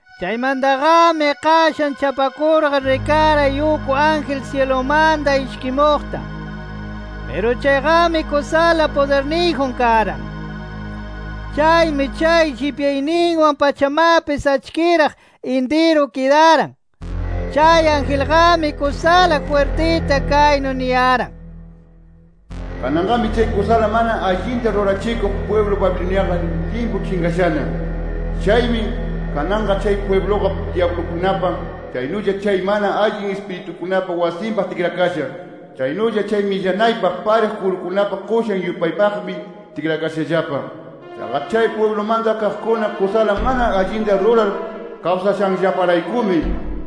Chaymantaqami, qashan chapakurqa rikaray uk ángel syilumanta ishkimuqta. Piru chayqami kusala pudirniyjun karan. Chaymi chay llipyayninwan pachamapis achkiraq intiru kidaran. Chay angelqami kusala jwirtita kaynu niyaran: “¡Kananqami chay kusala mana allinta rurachikuq pwiblu Babiloniaqa limpu chinqashana! ¡Chaymi kananqa chay pwibluqa dyablukunapa, chaynulla chay mana allin ispiritukunapa wasinpaq tikrakasha! ¡Chaynulla chay millanaypaq pariq kurukunapa qushan yupaypaqmi tikrakashallapa! Chaqa chay pwiblumanta kaqkuna kusala mana allinta rurar kawsashanllaparaykumi,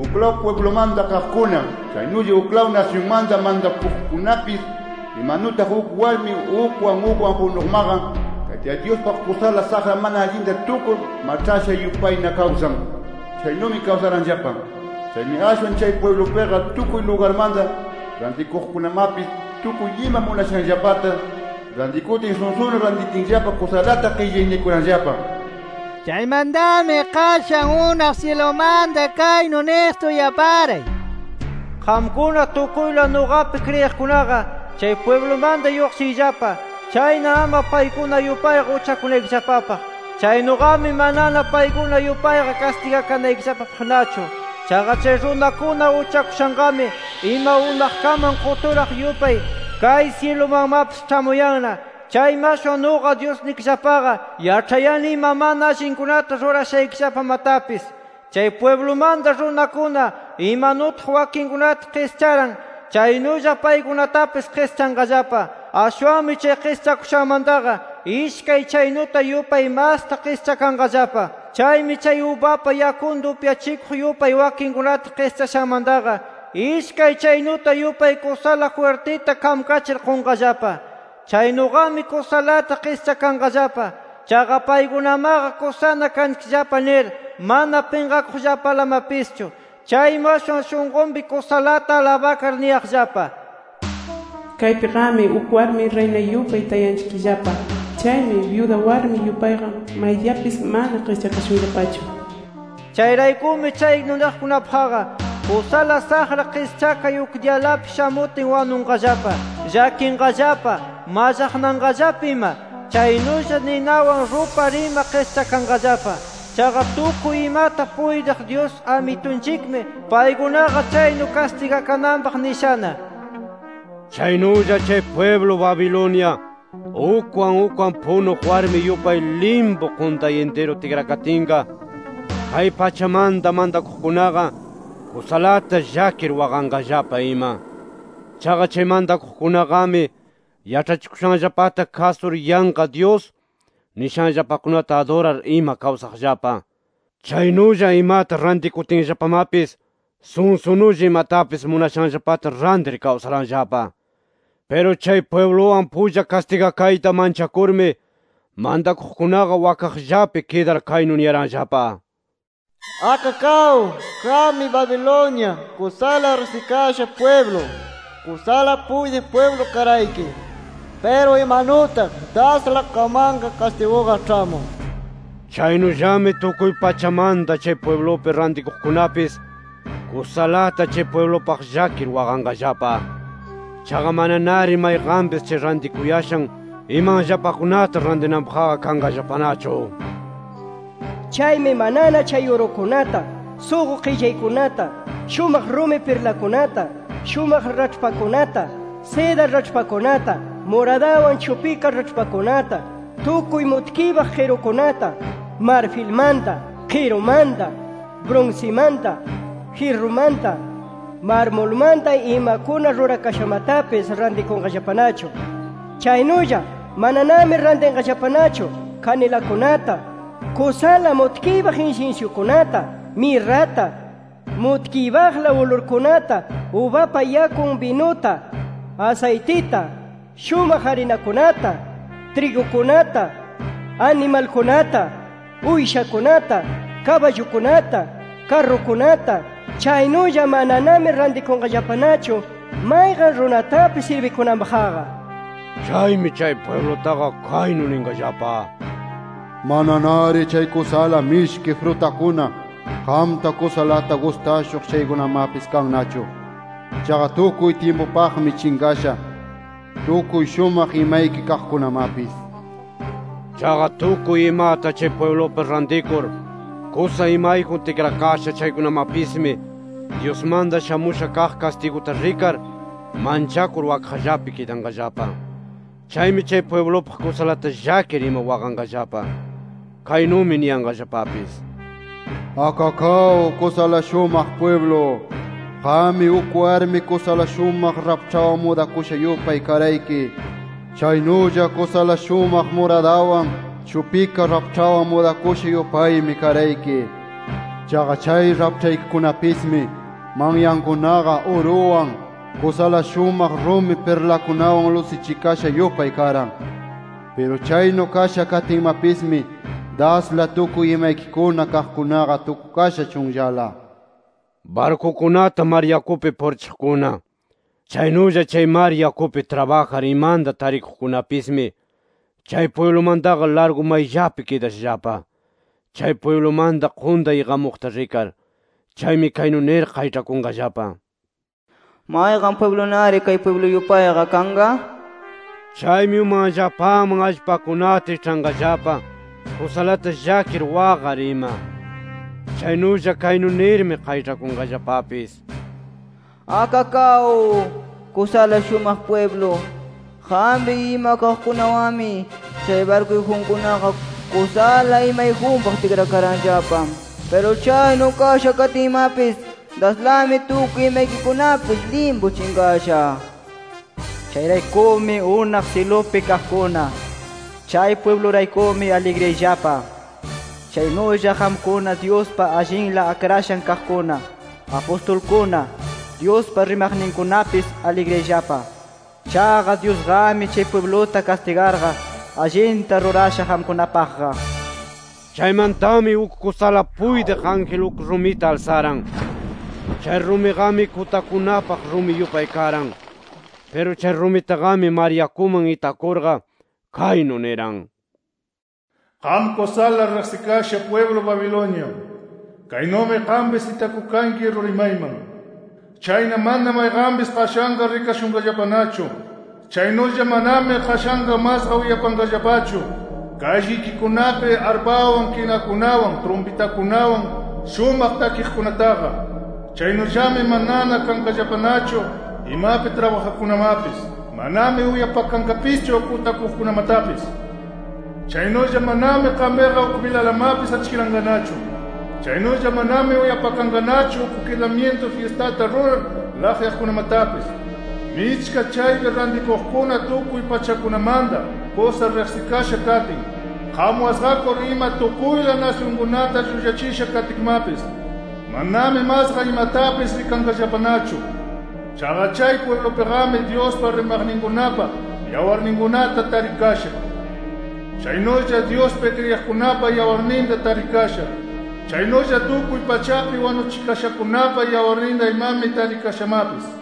uklaw pwiblumanta kaqkuna, chaynulla uklaw nasyunmanta mantakuqkunapis imanutaq uk warmi ukwan ukwan punuqmaqa Tayta Dyuspaq kusala saqra mana allinta tukur maĉhasha yupayna kawsan, chaynumi kawsaranllapa. Chaymi ashwan chay pwiblupiqa tukuy lugarmanta rantikuqkunamapis, tukuy ima munashanllapata rantikutin, sunsunu rantitinllapa kusalata qillaynikuranllapa”. Chaymantami qashan unaq syilumanta kaynu niqta uyaparay: “Qamkuna tukuyla nuqapi kriyiqkunaqa, chay pwiblumanta lluqshiyllapa. Chayna ama paykuna yupayqa uchakunaykillapapaq. Chaynuqami manana paykuna yupayqa kastigakanaykillapapaqnachu. Chaqa chay runakuna uchakushanqami, ima unaqkaman quturaq yupay kay syilumanmapis ĉhamuyanna. Chaymi ashwan nuqa Dyusnikillapaqa yaĉhayani ima mana allinkunata rurashaykillapamatapis. Chay pwiblumanta runakuna imanutaq wakinkunata qischaran chaynulla paykunatapis qischanqallapa. Ashwanmi chay qischakushanmantaqa, ishkay chaynuta yupay masta qischakanqallapa. Chaymi chay ubapa yakunta upyachikuq yupay wakinkunata qischashanmantaqa, ishkay chaynuta yupay kusala jwirtita kamkachir qunqallapa. Chaynuqami kusalata qischakanqallapa. Chaqa paykunamaqa kusana kanchikllapa nir, mana pinqakuqllapalamapischu. Chaymi ashwan shunqunpi kusalata alabakar niyaqllapa: ‘Kaypiqami uk warmi riyna yupay tayanchikllapa. Chaymi byuda warmi yupayqa maydiyapis mana qischakashunllapachu’ nir. Chayraykumi chaynu niqkunapaqqa kusala saqra qischakay uk diyalapi shamutin wanunqallapa, llakinqallapa, mallaqnanqallapa ima. Chaynulla ninawan rupar ima qischakanqallapa. Chaqa tukuy imata puytiq Dyus Amitunchikmi, paykunaqa chaynu kastigakananpaq nishana. “Chaynulla chay pwiblu Babilonia ukwan ukwan punuq warmi yupay limpu quntay intiru tikrakatinqa kay pachamanta mantakuqkunaqa kusalata llakir, waqanqallapa ima. Chaqa chay mantakuqkunaqami yaĉhachikushanllapata kasur yanqa dyus nishanllapakunata adurar ima kawsaqllapa. Chaynulla imata rantikutinllapamapis sunsunulla imatapis munashanllapata rantir kawsaranllapa. Piru chay pwibluwan pulla kastigakayta manchakurmi mantakuqkunaqa wakaqllapi kidar kaynu niyaranllapa: ‘¡Akakaw, qammi Babilonia kusala riqsikasha pwiblu, kusala puytiq pwiblu karayki! Piru imanutaq dasla qammanqa kastiguqa ĉhamun’ nir. “Chaynullami tukuy pachamanta chay pwiblupi rantikuqkunapis kusalata chay pwiblupaq llakir waqanqallapa. Chaqa mananari mayqanpis chay rantikuyashan imanllapakunata rantinanpaqqa kanqallapanachu. Chaymi manana chay urukunata, suqu qillaykunata, shumaq rumi pirlakunata, shumaq raĉhpakunata, seda raĉhpakunata, muradawan chupika raĉhpakunata, tukuy mutkiypaq qirukunata, marfilmanta, qirumanta, brunsimanta, jyirrumanta, marmulmanta imakuna rurakashamatapis rantikunqallapanachu. Chaynulla mananami rantinqallapanachu kanilakunata, kusala mutkiypaq insinsyukunata, mirrata, mutkiypaqla ulurkunata, ubapa yakun binuta, asaytita, shumaq arinakunata, trigukunata, animalkunata, uyshakunata, kaballukunata, karrukunata. Chaynulla mananami rantikunqallapanachu mayqan runatapis sirbikunanpaqqa. “Chaymi chay pwiblutaqa, kaynu ninqallapa: ‘¡Mananari chay kusala mishki frutakuna qamta kusalata gustashuq chaykunamapis kannachu! ¡Chaqa tukuy tyimpupaqmi chinqasha, tukuy shumaq imayki kaqkunamapis!’ Chaqa tukuy imata chay pwiblupi rantikur, kusa imayjun tikrakasha chaykunamapismi Dyusmanta shamusha kaq kastiguta rikar manchakur wakaqllapi kidanqallapa. Chaymi chay pwiblupaq kusalata llakir ima waqanqallapa. Kaynumi niyanqallapapis: ‘¡Akakaw, kusala shumaq pwiblu! Qammi uk warmi kusala shumaq raĉhpawan mudakusha yupay karayki. Chaynulla kusala shumaq muradawan chupika raĉhpawan mudakusha yupaymi karayki. Chaqa chay raĉhpaykikunapismi, manyankunaqa uruwan, kusala shumaq rumi pirlakunawan lusichikasha yupay karan. ¡Piru chaynu kasha katinmapismi, dasla tukuy imaykikuna kaqkunaqa tukukasha chunllala!’ “Barkukunata mar yakupi purichiqkuna, chaynulla chay mar yakupi trabajar imanta tarikuqkunapismi, chay pwiblumantaqa largu mayllapi kidashallapa, chay pwiblumanta quntay iqamuqta rikar. Chaymi kaynu nir qayĉhakunqallapa: ‘¿Mayqan pwiblunari kay pwiblu yupayqa kanqa?’ nir. Chaymi umanllapaman allpakunata iĉhanqallapa kusalata llakir waqar ima. Chaynulla kaynu nirmi qayĉhakunqallapapis: ‘¡Akakaw, kusala shumaq pwiblu! Qampi ima kaqkunawanmi, chay barkuyjunkunaqa kusala imayjunpaq tikrakaranllapa. ¡Piru chaynu kasha katinmapis daslami tukuy imaykikunapis limpu chinqasha! Chayraykumi unaq syilupi kaqkuna, chay pwibluraykumi aligriyayllapa. Chaynulla qamkuna Dyuspa allinla akrashan kaqkuna, apustulkuna, Dyuspa rimaqninkunapis aligriyayllapa. Chaqa Dyusqami chay pwibluta kastigarqa, allinta rurasha qamkunapaqqa’”. Chaymantami uk kusala puytiq ángel uk rumita alsaran. Chay rumiqami kutakunapaq rumi yupay karan. Piru chay rumitaqami mar yakuman itakurqa, kaynu niran: “Qam kusala riqsikasha pwiblu Babilonia, kaynumi qampis itakukanki ruri mayman. Chayna mana mayqanpis qashanqa rikashunqallapanachu. Chaynulla manami qashanqa masqa uyapanqallapachu kallikikunapi arpawan, kinakunawan, trumpitakunawan shumaq takiqkunataqa. Chaynullami manana kanqallapanachu imapi trabajaqkunamapis. Manami uyapakanqapischu kutakuqkunamatapis. Chaynulla manami qampiqa uk bilalamapis achkiranqanachu. Chaynulla manami uyapakanqanachu uk kidamyintu fyistata rurar laqyaqkunamatapis. Michka chaypi rantikuqkuna tukuy pachakunamanta kusa riqsikasha katin, qam wasqakur ima tukuyla nasyunkunata llullachisha katkimapis, manami masqa imatapis rikanqallapanachu nir. Chaqa chay pwiblupiqami, Dyuspa rimaqninkunapa yawarninkunata tarikasha. Chaynulla Dyuspi kriyiqkunapa yawarninta tarikasha. Chaynulla tukuy pachapi wanuchikashakunapa yawarninta imami tarikashamapis”.